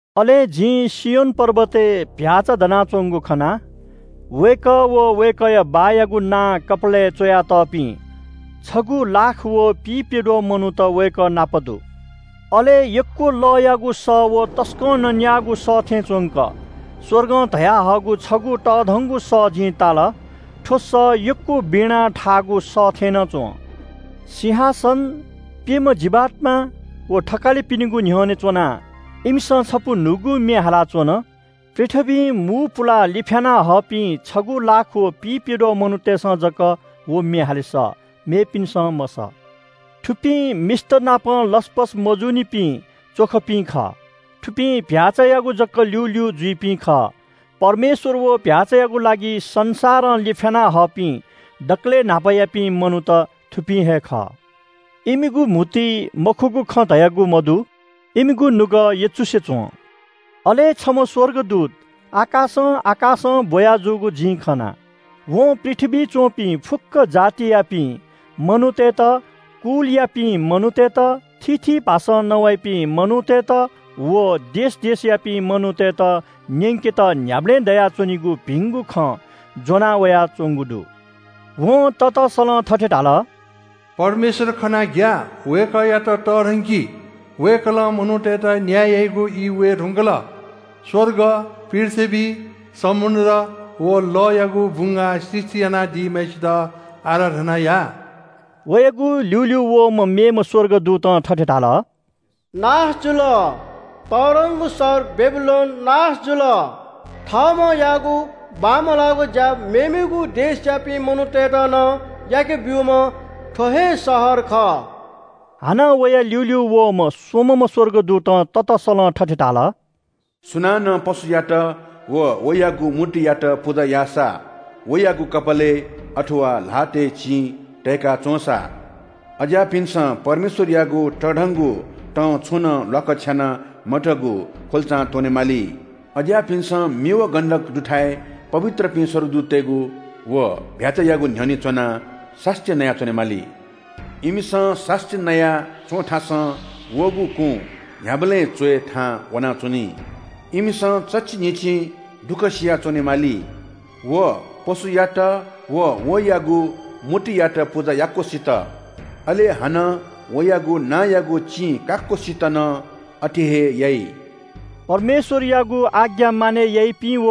अले जिं सियोन पर्वतय् चीधिकःम्‍ह भ्‍याःचा दनाच्‍वंगु खना। वय्‌कः व वय्‌कःया बाःयागु नां कपालय् च्‍वयातःपिं छगू लाख व पिइप्‍यद्वः मनूत वय्‌कः नाप दु। अले यक्‍व लःयागु सः व तसकं नँ न्‍याःगु सः थें च्‍वंक स्‍वर्गं धयाहःगु छगू तःधंगु सः जिं ताल। थ्‍व सः यक्‍व वीणा थाःगु सः थें नं च्‍वं। सिंहासन, प्‍यम्‍ह जीवात्‍मा, व थकालिपिनिगु न्‍ह्यःने च्‍वनाः इमिसं छपु न्‍हूगु म्‍ये हालाच्‍वन। पृथ्‍वीं मू पुलाः लिफ्‍याना हःपिं छगू लाख व पिइप्‍यद्वः मनूतय्‌सं जक व म्‍ये हाले सः, मेपिन्‍सं मसः। थुपिं मिस्‍तनापं लसपस मजूनिपिं च्‍वखपिं खः। थुपिं चीधिकःम्‍ह भ्‍याःचायागु जक ल्‍यूल्‍यू जुइपिं खः। परमेश्‍वर व चीधिकःम्‍ह भ्‍याःचायागु लागि संसारं लिफ्‍याना हःपिं दकलय् न्‍हापायापिं मनूत, थुपिं हे खः। इमिगु म्‍हुतुइ मखुगु खँ धयागु मदु, इमिगु नुगः यचुसे च्‍वं। अले छम्‍ह स्‍वर्गदूत आकाशं आकाशं ब्‍वया जूगु जिं खना। वं पृथ्‍वीइ च्‍वंपिं फुक्‍क जातियापिं मनूतय्‌त, कुलयापिं मनूतय्‌त, थीथी भाषां नवाइपिं मनूतय्‌त, व देश देशयापिं मनूतय्‌त न्‍यंकेत न्‍ह्याबलें दयाच्‍वनीगु भिंगु खँ ज्‍वना वयाच्‍वंगु दु। वं ततसलं थथे धाल – “परमेश्‍वर खनाः ग्‍या। वय्‌कःयात तःधंकि। वय्‌कलं मनूतय्‌त न्‍याय याइगु ई वये धुंकल। स्‍वर्ग, पृथ्‍वी, समुद्र व लःयागु बुंगाः सृष्‍टि यानादीम्‍हय्‌सित आराधना या।” वयागु ल्‍यूल्‍यू वःम्‍ह मेम्‍ह स्‍वर्गदूतं थथे धाल – “नाश जुल, तःधंगु शहर बेबिलोन नाश जुल। थःम्‍हं याःगु बांमलाःगु ज्‍या मेमेगु देशयापिं मनूतय्‌त नं याकेब्‍यूम्‍ह थ्‍व हे शहर खः।” हानं वया ल्‍यूल्‍यू वःम्‍ह स्‍वम्‍हम्‍ह स्‍वर्गदूतं ततसलं थथे धाल – “सुनानं पशुयात व वयागु मूर्तियात पुजा याःसा, वयागु कपालय्, अथवा ल्‍हातय् चिं तयेका च्‍वंसा, अज्‍याःपिन्‍सं परमेश्‍वरयागु तःधंगु तं छुनं ल्‍वाकछ्याना मतःगु ख्‍वल्‍चां त्‍वने माली। अज्‍याःपिन्‍सं मि व गन्‍धक दुथाय् पवित्रपिं स्‍वर्गदूततय्‌गु व चीधिकःम्‍ह भ्‍याःचायागु न्‍ह्यःने च्‍वनाः सास्‍ती नया च्‍वनेमाली। इमिसं सास्‍ती नया च्‍वंथासं वःगु कुँ न्‍ह्याबलें च्‍वय् थाहां वनाच्‍वनी। इमिसं चच्‍छि न्‍हिच्‍छि दुःखसिया च्‍वनेमाली। व पशुयात व वयागु मूर्तियात पुजा याक्‍वसित, अले हानं वयागु नांयागु चिं काक्‍वसित नं अथे हे याइ।” परमेश्‍वरयागु आज्ञा मानय् याइपिं व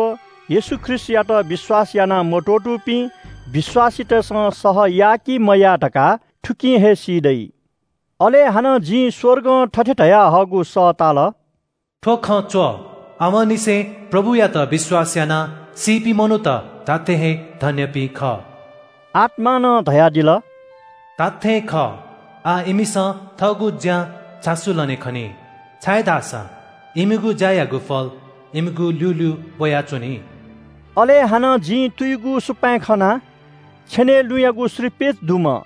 येशू ख्रीष्‍टयात विश्‍वास याना मत्‍वःतूपिं विश्‍वासीतय्‌सं सह याः कि मयाः धकाः थुकिं हे सी दइ। अले हानं जिं स्‍वर्गं थथे धयाहःगु सः ताल – “थ्‍व खँ च्‍व, आवंनिसें प्रभुयात विश्‍वास यानाः सीपिं मनूत धात्‍थें हे धन्‍यपिं खः।” आत्‍मां नं धयादिल – “धात्‍थें खः, आः इमिसं थःगु ज्‍यां झासु लने खनी, छाय्‌धाःसा इमिगु ज्‍यायागु फल इमिगु ल्‍यूल्‍यू वयाच्‍वनी।” अले हानं जिं तुयुगु सुपाँय् खना। छेनय् लुँयागु श्रीपेच दुम्‍ह,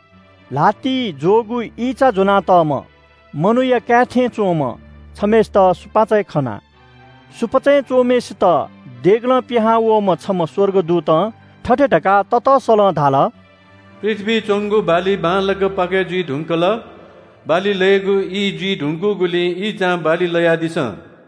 ल्‍हातिइ ज्‍वःगु ईंचा ज्‍वनातःम्‍ह मनूया काय् थें च्‍वंम्‍ह छम्‍हय्‌सित सुपाँचय् खना। सुपाँचय् च्‍वंम्‍हय्‌सित देगलं पिहांवःम्‍ह छम्‍ह स्‍वर्गदूतं थथे धकाः ततसलं धाल – “पृथ्‍वीइ च्‍वंगु बाली बांलाक पाकय् जुइ धुंकल, बाली लयेगु ई जुइ धुंकूगुलिं ईंचां बाली लयादिसँ।”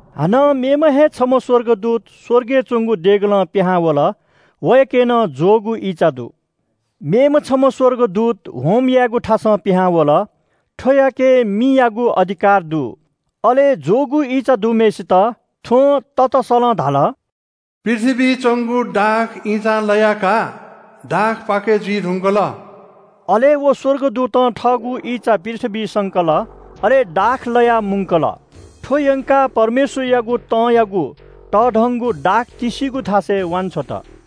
हानं मेम्‍ह हे छम्‍ह स्‍वर्गदूत स्‍वर्गय् च्‍वंगु देगलं पिहां वल। वयाके नं ज्‍वःगु ईंचा दु। मेम्‍ह छम्‍ह स्‍वर्गदूत होम यायेगु थासं पिहां वल। थ्‍वयाके मियागु अधिकार दु। अले ज्‍वःगु ईंचा दुम्‍हय्‌सित थ्‍वं ततसलं धाल – “पृथ्‍वीइ च्‍वंगु दाख ईंचां लया का, दाख पाकय् जुइ धुंकल।” अले व स्‍वर्गदूतं थःगु ईंचा पृथ्‍वीइ संकल। अले दाख लयाः मुंकल। थ्‍व यंकाः परमेश्‍वरयागु तंयागु तःधंगु दाख तिस्‍सिगु थासय् वांछ्वत।